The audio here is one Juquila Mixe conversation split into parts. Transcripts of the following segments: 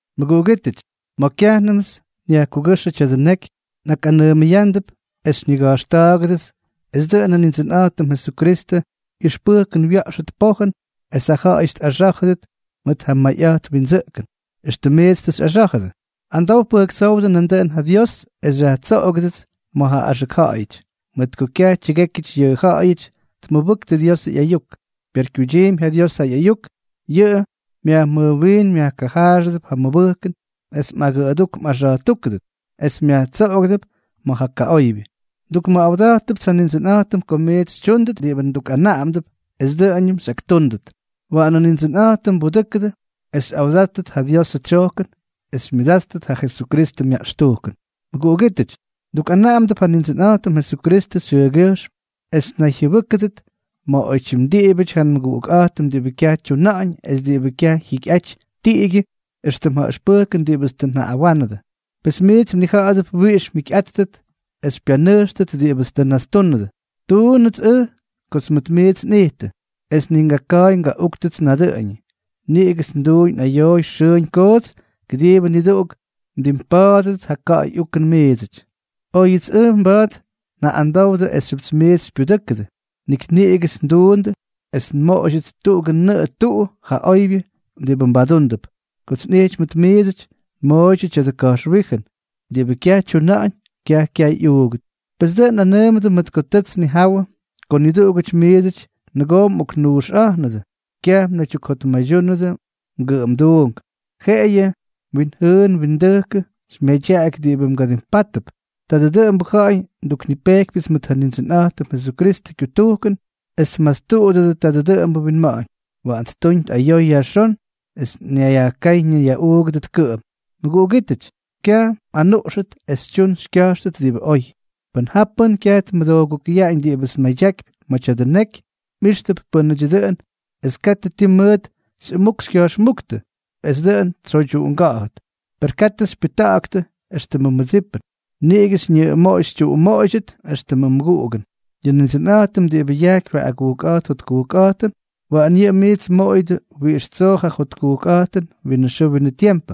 Mʉguꞌugítʉty, ma̱ kyajnʉmts nyajkugʉ́xʉ tya̱dʉ neky, nꞌakꞌanʉʉmʉyándʉp es xyñiga̱jxta̱ꞌa̱ktʉdʉts es dʉꞌʉn ja Nindsʉnꞌa̱jtʉm Jesukristʉ ꞌyʉxpʉjkʉn wya̱ꞌxʉt pojʉn es ja ja̱ꞌa̱yʉty tꞌaxá̱jʉdʉt mʉt ja mayꞌa̱jt windsʉꞌkʉn, éxtʉm miits tʉ xyꞌaxá̱jʉdʉ. Amdow pʉjktsówdʉ nandʉꞌʉn ja Dios es xyajtsoꞌogʉdʉts ma̱ ja axʉk ja̱ꞌa̱yʉty, mʉt ko kyaj tyʉgékyʉty yʉ ja̱ꞌa̱yʉty tmʉbʉktʉ Diosʉ ꞌyayuk. Per kyuydyiimpy ja Dios ja ꞌyayuk, yʉꞌʉ myajmʉjwiin myajkajaaxʉdʉp ja mmʉbʉjkʉn es mꞌagʉꞌʉdúk mꞌaxa̱jtúkʉdʉp es myajtsoꞌogʉdʉp ma̱ ja kaꞌoybyʉ. Ndukmʉꞌawda̱jtʉpts ja Nindsʉnꞌa̱jtʉm ko miits xytyúndʉt diꞌibʉ ndukꞌanaꞌamdʉp, es dʉꞌʉñʉm xyꞌaktúndʉt. Waꞌanʉ Nindsʉnꞌa̱jtʉm mbudʉ́kʉdʉ es xyjáwʉdʉt ja Diosʉ tsyojkʉn es xymyʉdátʉt ja Jesukristʉ myaꞌxtujkʉn. Mʉguꞌugítʉty, ndukꞌanaꞌamdʉp ja Nindsʉnꞌa̱jtʉm Jesukristʉ xyʉʉgyʉjxm, es mnayjyʉbʉ́kʉdʉt ma̱ oytyim diꞌibʉty ja nmʉguꞌukꞌa̱jtʉm diꞌibʉ kyaj tyuna̱ꞌa̱ñ es diꞌibʉ kyaj jyikyꞌaty tiꞌigyʉ éxtʉm ja ʉxpʉjkʉn diꞌibʉts tʉ njaꞌꞌawánʉdʉ. Pes miits mnija̱ꞌa̱dʉp wiꞌix mjikyꞌáttʉt es xypyanʉjxtʉt diꞌibʉts tʉ nnastúnʉdʉ; tuunʉts ʉj kots mʉʉt miits nꞌittʉ, es ni ngaka̱a̱y ngaꞌúktʉts nadʉꞌʉñʉ. Niꞌigʉts nduuñ nꞌayooy xʉʉñ koots kʉdiibʉ niduꞌuk mdimpa̱a̱dʉdʉt ja ka̱ꞌa̱y ukʉn miidsʉty. Oyʉts ʉj mba̱a̱t njaꞌꞌamdowdʉ esxyʉpts miits xypyudʉ́kʉdʉ, nik niꞌigʉts nduundʉ es nmoꞌoydyʉt tuꞌugʉ nʉꞌʉ tuꞌu ja oybyʉ diꞌibʉ mbadúndʉp. Kots nꞌijty mʉt miidsʉty, nmooydyʉ tya̱dʉ ka̱jxwíjʉn: “Diꞌibʉ kyaj tyuna̱ꞌa̱ñ, kyaj kyay ꞌyuugʉt.” Pes dʉꞌʉn nꞌanʉʉmʉdʉ mʉt ko tʉts nnijawʉ ko niduꞌugʉty miidsʉty nʉgoo mꞌoknuuxꞌa̱jnʉdʉ, kyaj mnaydyukjotmaydyúnʉdʉ mgʉꞌʉmduunk, jeꞌeyʉ mwinjʉʉn mwindʉjkʉ xymyadyaꞌaky diꞌibʉ mgadimpátʉp. Tadʉ dʉꞌʉmbʉ ja̱ꞌa̱y nduknipejkypyʉts mʉt ja Nindsʉnꞌa̱jtʉm Jesukristʉ kyutujkʉn, es tmastuꞌudʉdʉ tadʉ dʉꞌʉmbʉ winma̱ꞌa̱ñ. Waꞌan ttuñ tꞌayoy yajxón es ñayyajkáy ñayyaꞌuugʉdʉt kʉꞌʉm. Mʉguꞌugítʉty, kyaj mꞌanuꞌxʉt es xytyun xykya̱jxtʉt diꞌibʉ oy. Pʉn ja pʉ́n kyaj tmʉdoogukʉyaꞌañ diꞌibʉts nmadyakypy ma̱ tya̱dʉ neky, mꞌíxtʉp pʉ́nʉdyʉ dʉꞌʉn es katʉ ti mʉʉt xyꞌʉmuk xykya̱jxmúktʉ, es dʉꞌʉn tsyoydyuꞌunga̱ꞌa̱t. Per katʉ xypyʉjta̱ꞌa̱ktʉ éxtʉmʉ mmʉdsipʉn, niꞌigʉ xyñʉꞌʉmoꞌoy xytyuꞌumoꞌoydyʉt éxtʉmʉ mmʉguꞌugʉn. Yʉ Nindsʉnꞌa̱jtʉm diꞌibʉ yajkypy ja agujkꞌa̱jt jotkujkꞌa̱jtʉn, waꞌan yʉꞌʉ miits mmoꞌoyʉdʉ wiꞌix tsoo ja jotkujkꞌa̱jtʉn winʉ xʉʉ winʉ tiempʉ,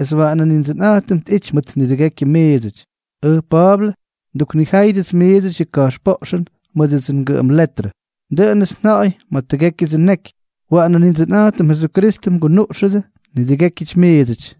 es waꞌanʉ Nindsʉnꞌa̱jtʉm tꞌity mʉt nidʉgekyʉ miidsʉty. Ʉj Pa̱a̱blʉ, nduknijáyʉdʉts miidsʉty yʉ ka̱jxpoꞌxʉn mʉdʉdsʉ ngʉꞌʉm letrʉ. Dʉꞌʉnʉts nja̱ꞌa̱y ma̱ tʉgékyʉdsʉ nneky. Waꞌanʉ Nindsʉnꞌa̱jtʉm Jesukristʉ mgunuꞌxʉdʉ nidʉgékyʉty miidsʉty.